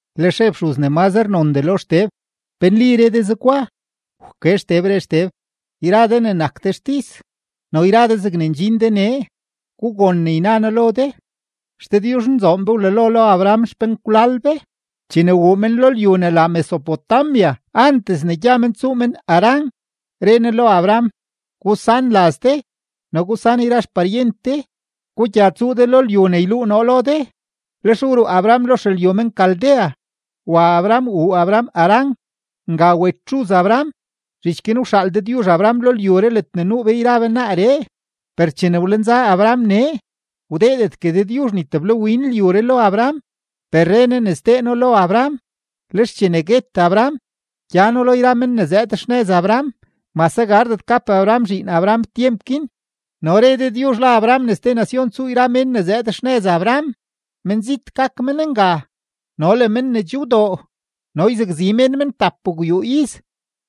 Lex re fxuz ne mazre nondee lo Xteb: ―¿Pe nli re de zegwa? Wke Xteb, re Xteb: ―Yra de ne nak de xtis no yra de zegne ndxin de nee, gugon ne yna noo lo de. XDëdyuzhnzoon be wlalo lo Abraham xpenkwlal be chene wuu men lo lyu ne la Mesopotamia antes ne gya men tsuu men Harán. Re Ne lo Abraham: “Gusan laz de no gusan yra xparyent de, gugya tsuu de lo lyu ne yluu noo lo de.” Lex wruu Abraham lo xelyu men-Caldea, wa Abraham wuu Abraham Harán. Nga wet xuz Abraham; zhich guin wxaal Dëdyuzh Abraham lo lyuree ledne nuu be yra be naaree. Per chene wlenza Abraham nee, wdeedetgue Dëdyuzh ni teblawin lyuree lo Abraham, per re Ne ne sdee No lo Abraham. Lex chene guet Abraham, gyano lo yra men ne zëëd xnëz Abraham; mase gardet gap Abraham zhiin Abraham tyemp guin. No re Dëdyuzh lo Abraham ne ste nacion tsuu yra mén ne zëëd xnëz Abraham; menzit gak men nga no le men ne che wdoo, no yzakzi mén men tapgwyuu iz.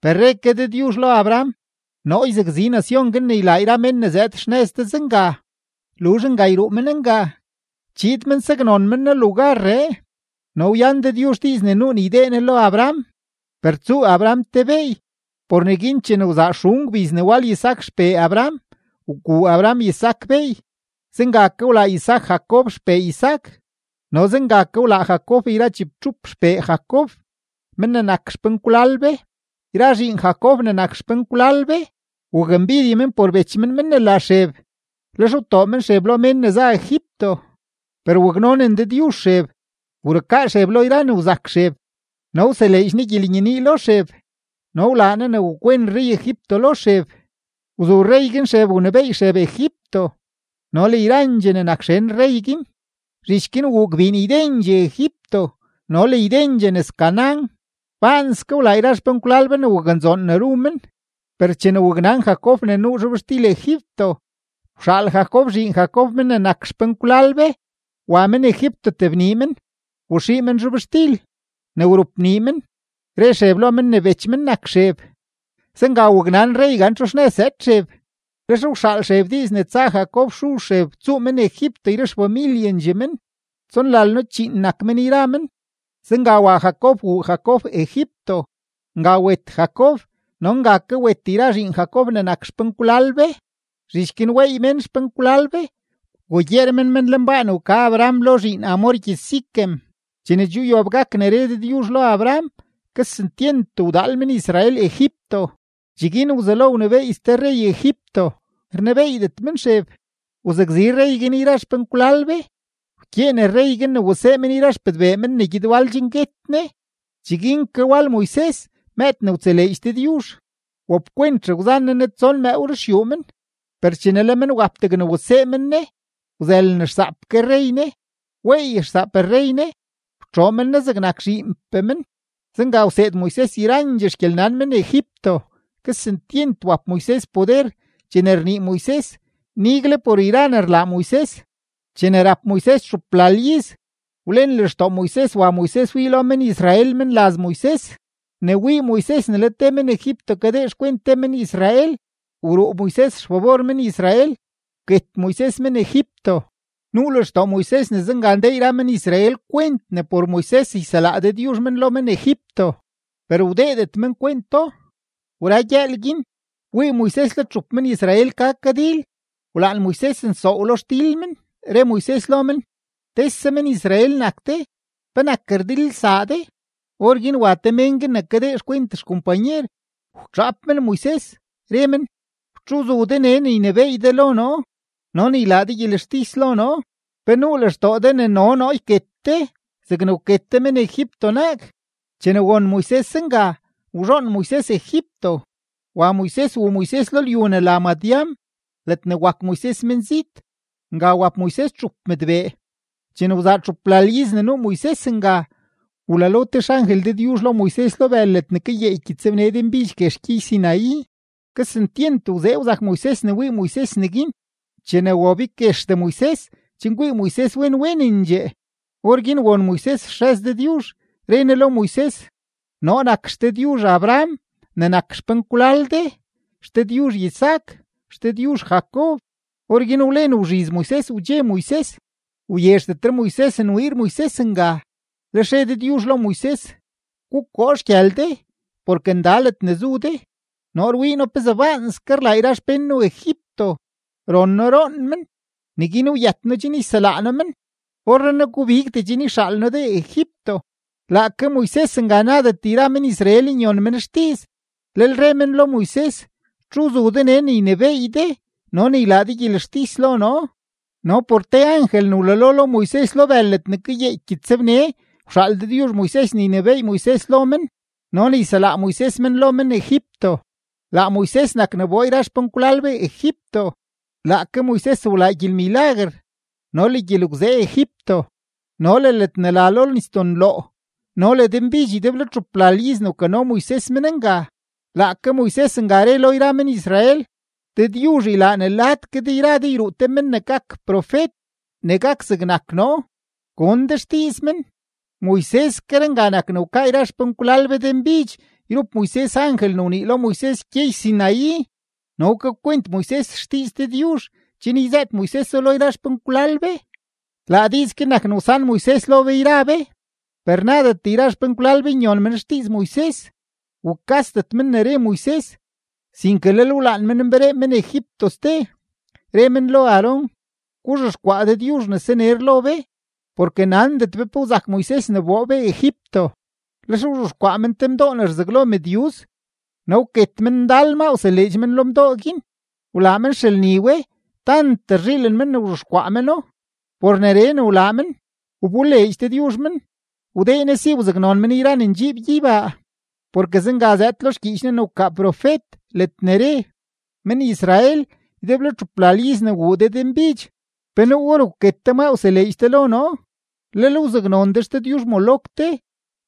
Per re ke Dëdyuzh lo Abraham: “Noo yzakzi nacion guin ne ylaa yra mén ne zëëd xnëz de zenga. Luzh nga yruu men nga, chiid men saknon men noo lugarree.” No wyan Dëdyuzh diiz ne nuu ne ydee Ne lo Abraham, per tsuu Abraham te beey. Por neguin chene wzaa xun gbiz ne wal Isaac xpee Abraham, wguu Abraham Isaac beey. Zenga ke wlaa Isaac Jacob xpee Isaac, no zenga ke wlaa Jacob yra chibtxup xpee Jacob, men ne nak xpenkwlal be. ’Yra zhiin Jacob ne nak xpenkwlal be, wakmbidye men por bech men men ne la Xeb. Lex wtoo men Xeb lo mén ne za Egipto; per waknonen Dëdyuzh Xeb, wrukaa Xeb lo yra ne wzak Xeb; no wseleedx Ne gyelenyenii lo Xeb no wlaa ne wakwen rrey-Egipto lo Xeb; wzu rrey guin Xeb wnebééy Xeb Egipto no le yrandxee ne nak xen rrey guin. ’Zhich guin wuu gbiin ydendxee Egipto no le ydendxee Canaán; baanske wlaa yra xpenkwlal be ne waknzoon ne ru men. Per chene waknan Jacob ne nuu zhobxtil Egipto, wxaal Jacob zhiin Jacob mén ne nak xpenkwlal be wa men Egipto tebnii men, waxii men zhobxtil. Ne wrupnii men, re Xeb lo men ne bech men nak Xeb; zenga waknan rrey gan txu xnëz zëëd Xeb. Lex wxaal Xeb diiz ne tsa Jacob xuz Xeb tsuu men Egipto yra xfamilyendxee men, tsonlalno-chíín nak men yra men. Zenga wa Jacob wuu Jacob Egipto; nga wet Jacob no nga ke wet yra zhiin Jacob ne nak xpenkwlal be. Zhich guin weey mén xpenkwlal be, wgugyeer men men lenbaa ne wka Abraham lo zhiin Hamor gyëz-Siquem. ’Chene che wyob gak ne re Dëdyuzh lo Abraham, kesentyent wdaal men-Israel Egipto. Cheguin wzelo wnebééy ste rrey Egipto, rnebeeydet men Xeb. Wzakzi rrey guin yra xpenkwlal be; wkyeen rrey guin men wasee men yra xpëdbee men ne gyed wal chen guet ne. Cheguin ke wal Moises mëëd ne wtseleedx Dëdyuzh; wapkwent xegwzan ne ne tson mëëw ruxyuu men. Per chene le men wap degne wasee men ne, wzëlen xsaap ke rrey ne, weey xsaap rrey ne, wtxoo men ne zegnak zhiinpee men. Zenga wseed Moises yrandxee xgyelnan men-Egipto, kesentyent wap Moises poder chene rnii Moises nigle por yra ne rlaa Moises. ’Chene rap Moises txuplal iz, wlen lextoo Moises wa Moises wii lo men-Israel menlaz Moises. Ne wii Moises ne le te men-Egipto kadee xkwent te men-Israel, wruu Moises xfabor men-Israel, wket Moises men-Egipto. Nuu lextoo Moises ne zenga ndee yra men-Israel kwent ne por Moises yselaa Dëdyuzh men lo men-Egipto, per wdeedet men kwento. Wra gyëël guin, wii Moises le txup men-Israel ka kadil, wlaan Moises nsoow lo xdil men, re Moises lo men: “Tese men-Israel nak de. ¿Penak rdilelsaa de?” Orguin wa te mén guin ne kadee xkwent xkompanyer, wtxaap men Moises, re men: “¿Txu wzu de nee ne ynebééy de lo noo no ne ylaa de gyelextis lo noo? ¿Pe nuu lextoo de ne no noo yket de zegne wket de men-Egipto naag?” Chene won Moises zenga, wzhoon Moises Egipto, wa Moises wuu Moises lo lyu ne la Madián ledne wak Moises menzit. Nga wap Moises txup mëdbee. ’Chene wzaa txuplal iz ne nuu Moises nga, wlalo te xangel Dëdyuzh lo Moises lo bël ledne kayeeky gyëtsbne denbidx guex gyey-Sinaí. Kesentyent wzee wzak Moises ne wii Moises neguin. Chene wabig guexdee Moises chen kwii Moises wen wenendxee, orguin won Moises xrëz Dëdyuzh, re Ne lo Moises: “Noo nak XDëdyuzh Abraham ne nak xpenkwlal de, XDëdyuzh Isaac, XDëdyuzh Jacob.” Orguin wlen wzhiz Moises wdxe Moises, wyezhdetre Moises nwiir Moises nga. Lex re Dëdyuzh lo Moises: “Gukoo xgyël de porke nda ledne zu de. Noo rwii noo pezee baanske rlaa yra xpén noo Egipto, ron noo roon men, neguin wyët noo chen yselaa noo men. Orrenaa gubigdee chen yxaal noo de Egipto.” ’Laake Moises nga nadet yra men-Israel nyon men xdiiz, lel re men lo Moises: “¿Txu wzu de nee ne ynebééy de no ne ylaa de gyelextis lo noo?” No por te angel ne wlalo lo Moises lo bël ledne kayeeky gyëtsbne, wxaal Dëdyuzh Moises ne ynebééy Moises lo men no ne yselaa Moises men lo men-Egipto. Laa Moises nak ne wboo yra xpenkwlal be Egipto. Laake Moises wlaa gyelmilaguer no le gyelgwzee Egipto no le ledne la lo Nisdoo Nloo no le denbidx ydeblo txuplal iz ne wkano Moises men nga. Laake Moises nga re lo yra men-Israel: “Dëdyuzh ylaa ne lad ke de yra de yruu te men ne gak profet ne gak zegnak noo; gon de xdiiz men.” Moiseskeree nga nak ne wkaa yra xpenkwlal be denbidx yrup Moises angel ne wnii lo Moises gyey-Sinaí, no wkakwent Moises xdiiz Dëdyuzh chen yzëët Moiseso lo yra xpenkwlal be, laa diiz guin nak ne wsan Moises lo be yra be. ’Per nadet yra xpenkwlal be nyon men xdiiz Moises, wukasdet men ne re Moises, sinke lel wlaan men nberee men Egipto ste. Re men lo Aarón: “Guzhexkwaa dëdyuzh ne saner lo be, porke nandet be pe wzak Moises ne wboo be Egipto.” Lex wzhexkwaa men te mdoo ne rzaglo mëdyuz, no wket men ndal maa wseleedx men ma lo mdoo guin; wlaa men xelni we tant rzhiilen men ne wzhexkwaa meno. Por neree ne wlaa men, wboleedx Dëdyuzh men, wdee Ne si wzaknon men yra ne ndxiib gyeybaa. Porke zenga zëëd lo xgyiich Ne ne wkaa profet ledne re: Men-Israel, ydeblo txuplal iz ne wuu de denbidx, ¿pe nuu or wket de maa wseleedx de lo noo? Lel wzaknon de xdëdyuzh-Moloc de,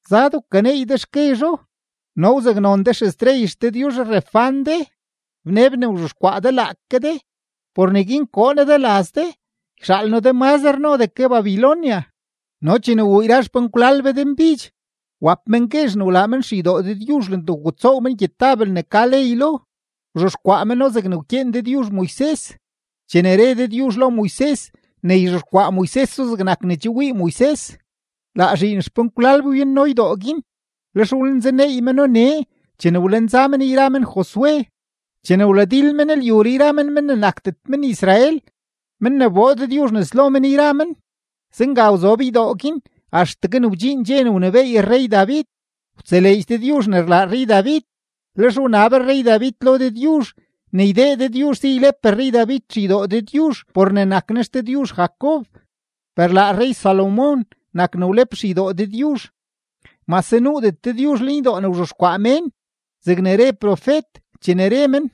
zad wkaneey de xguezho, no wzaknon de xestrey xdëdyuzh-Renfán de, bneb ne wzhexkwaa de laake de. Por neguin koo noo de laz de, yxaal noo de mazre nodee ke Babilonia. ’No chene wuu yra xpenkwlal be denbidx, wap men guezh ne wlaa men xeydoo Dëdyuzh ledne wgutsoow men gyetabel ne ka ley lo; wzhexkwaa meno zegne wkyeen Dëdyuzh Moises, chene re Dëdyuzh lo Moises ne yzhexkwaa Moiseso zegnak ne che wii Moises. Laa zhiin xpenkwlal be wyanno ydoo guin, lex wlenzaneey meno nee chene wlenza men yra men Josué, chene wladil men lyuree yra men mén ne nakdet men-Israel, men ne wboo Dëdyuzh nes lo men yra men; zenga wzob ydoo guin axtegue ne wdxiin dxe ne wnebééy rrey-David. Wtseleedx Dëdyuzh ne rlaa rrey-David, lex wnab rrey-David lo Dëdyuzh ne ydee Dëdyuzh si ylep rrey-David xeydoo Dëdyuzh por ne nak Ne XDëdyuzh Jacob. Per laa rrey-Salomón nak ne wlep xeydoo Dëdyuzh, mase nuudet Dëdyuzh lenydoo ne rzhexkwaa mén, zegne re profet chene re men: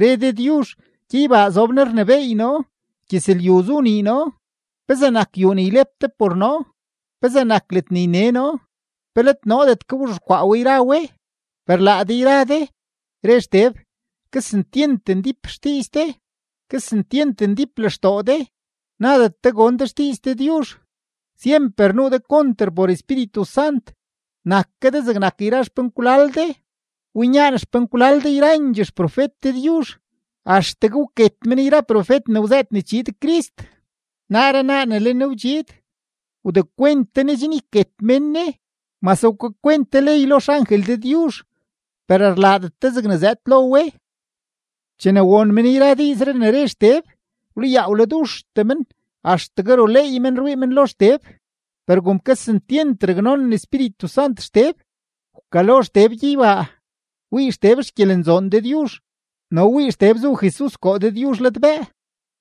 Re Dëdyuzh: Gyeybaa zob noo rnebééy noo, gyëzlyu zu nii noo. ¿Pezee nak yuu ne ylep de por noo? ¿Pezee nak ledne yne noo? ¿Pe let noodet ke wzhexkwaa we yra we? ’Per laa de yra de ―re Xteb― kesentyent ndíp xdiiz de, kesentyent ndíp lextoo de, nadet de gon de xdiiz Dëdyuzh, syemper nuu de konter por Espíritu Sant, nak ke de zegnak yra xpenkwlal de. Winyaan xpenkwlal de yrandxee xprofet Dëdyuzh. Axtegue wket men yra profet ne wzëët ne chiid Crist; naaree naa ne le Ne wdxiid, wdekwent de Ne chen yket mén Ne. Mase wkakwent de ley lo xangel Dëdyuzh, per rlaadet de zegne zëëd lo we. Chene won men yra diizree ne re Xteb, wlayaa wladuxtee men axtegue ruleey men rwii men lo Xteb. Per kom kesentyent raknonen Espíritu Sant Xteb, wkalo Xteb gyeybaa, wii Xteb xgyelenzoon Dëdyuzh no wii Xteb zu Jesus koo Dëdyuzh ladbëë.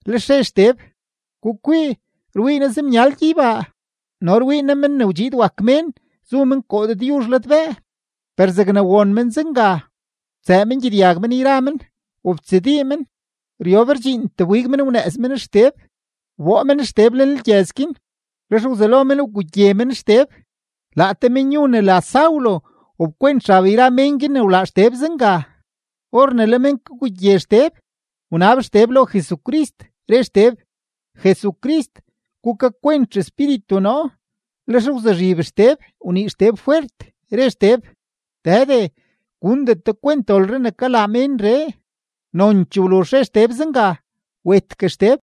Lex re Xteb: ―¡Gukwii! Rwii noo zemyal gyeybaa no rwii noo Men ne wdxiid wak Mén zu men koo Dëdyuzh ladbëë. Per zegne won men zenga, wtsëë men gyedyag men yra men, wobtsadii men, ryob rdxiintee wbig men wnëëz men Xteb. Wboo men Xteb lenlgyëz guin, lex wzelo men wgugye men Xteb. Laa te menyu ne la Saulo wapkwent xab yra men guin ne wlaa Xteb zenga. Or ne le men kagugye Xteb, wnab Xteb lo Jesucrist, re Xteb: ―Jesucrist, gukakwent xespíritu noo. Lex wzuzhib Xteb wnii Xteb fwert, re Xteb: ―Dëde, gundet de kwent dolree ne kalaa ménree. Nonchee wluzh re Xteb zenga, wetgue Xteb.